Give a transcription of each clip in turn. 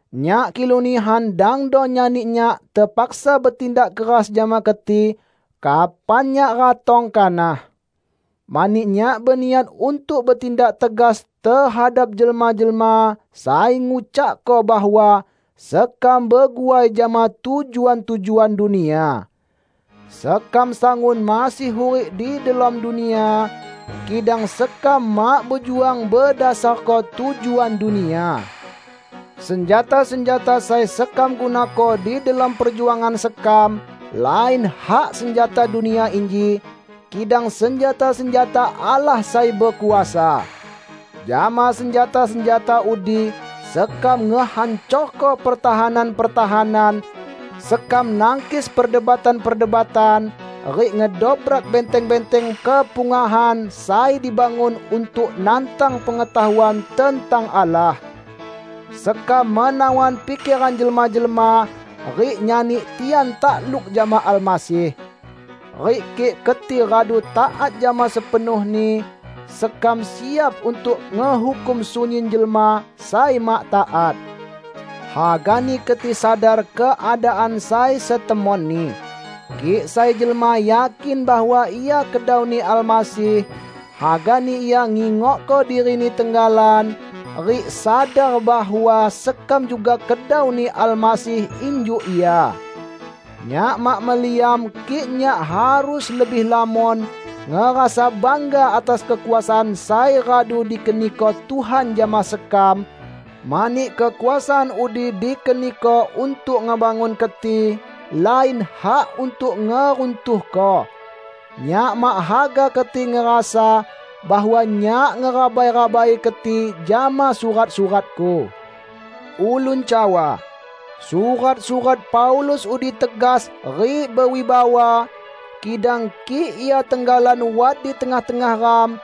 nyak kilu nihan dangdo nyani nyak tepaksa betindak keras jama keti kapan nyak ratong kanah. Mani nyak beniat untuk betindak tegas tehadap jelma-jelma sai ngucakko bahwa sekam beguai jama tujuan-tujuan dunia. Sekam sangun masih hurik di delom dunia, kidang sekam mak bejuang bedasarko tujuan dunia. Senjata-senjata sai sekam gunako di delom perjuangan sekam lain hak senjata dunia inji, kidang senjata-senjata Allah sai bekuasa. Jama senjata-senjata udi sekam ngehancorko pertahanan-pertahanan; sekam nangkis perdebatan-perdebatan rik ngedobrak benteng-benteng kepungahan sai dibangun untuk nantang pengetahuan tentang Allah. Sekam menawan pikeran jelma-jelma rik nyani tian takluk jama Almasih. Rik kik keti radu taat jama sepenuhni, sekam siap untuk ngehukum sunyin jelma sai mak taat. Hagani keti sadar keadaan sai setemoni. Kik sai jelma yakin bahwa ia kedau-Ni Almasih, hagani ia ngingokko dirini tenggalan rik sadar bahwa sekam juga kedau-Ni Almasih injuk ia. Nyak mak meliam kik nyak harus lebih lamon ngerasa bangga atas kekuasaan sai radu dikeniko Tuhan jama sekam, mani kekuasaan udi dikeniko untuk ngebangun keti, lain hak untuk ngeruntuhko. Nyak mak haga keti ngerasa bahwa nyak ngerabai-rabai keti jama surat-suratku. Ulun cawa, "Surat-surat Paulus udi tegas rik bewibawa, kidang kik ia tenggalan wat di tengah-tengah ram,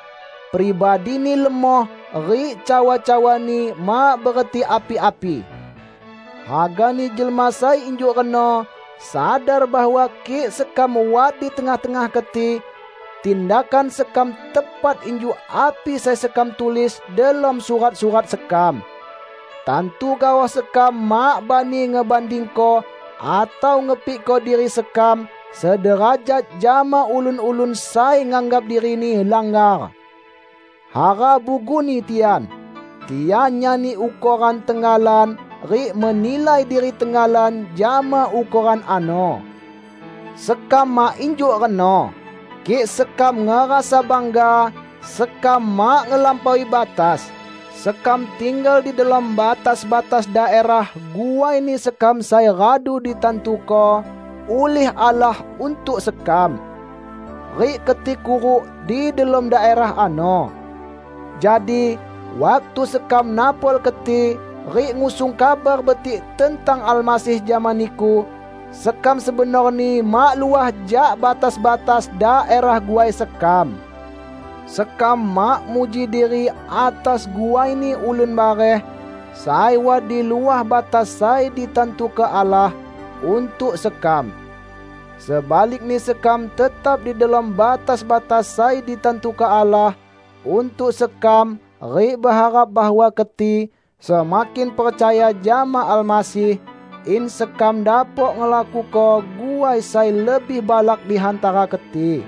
pribadini lemoh rik cawa-cawani mak bereti api-api!" Hagani jelma sai injuk reno sadar bahwa kik sekam wat di tengah-tengah keti, tindakan sekam tepat injuk api sai sekam tulis delom surat-surat sekam. Tantu gaoh sekam mak bani ngebandingko atau ngepikko diri sekam sederajat jama ulun-ulun sai nganggap dirini langgar. Hara buguni tian! Tian nyani ukoran tenggalan rik menilai diri tenggalan jama ukoran ano. Sekam mak injuk reno. Kik sekam ngerasa bangga, sekam mak ngelampaui batas. Sekam tinggal di delom batas-batas daerah guaini sekam sai radu ditantuko ulih Allah untuk sekam. Rik keti kuruk di delom daerah ano. Jadi, waktu sekam napol keti rik ngusung Kabar Betik tentang Almasih jama niku, sekam sebenorni mak luah jak batas-batas daerah guai sekam. Sekam mak muji diri atas guaini ulun bareh sai wat di luah batas sai ditantuko Allah untuk sekam. Sebalikni sekam tetap di delom batas-batas sai ditantuko Allah untuk sekam rik beharap bahwa keti semakin percaya jama Almasih, in sekam dapok ngelakuko guai sai lebih balak di hantara keti.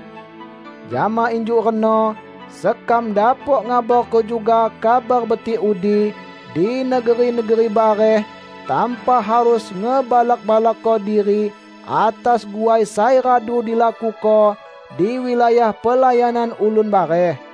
Jama injuk reno sekam dapok ngabarko juga Kabar Betik udi di negeri-negeri bareh tanpa harus ngebalak-balakko diri atas guai sai radu dilakuko di wilayah pelayanan ulun bareh.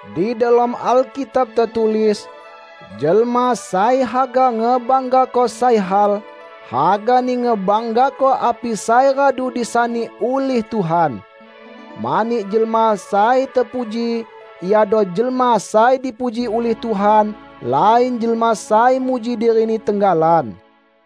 Di delom Alkitab tetulis, "Jelma sai haga ngebanggako sai hal, hagani ngebanggako api sai radu disani ulih Tuhan." Mani jelma sai tepuji iado jelma sai dipuji ulih Tuhan, lain jelma sai muji dirini tenggalan.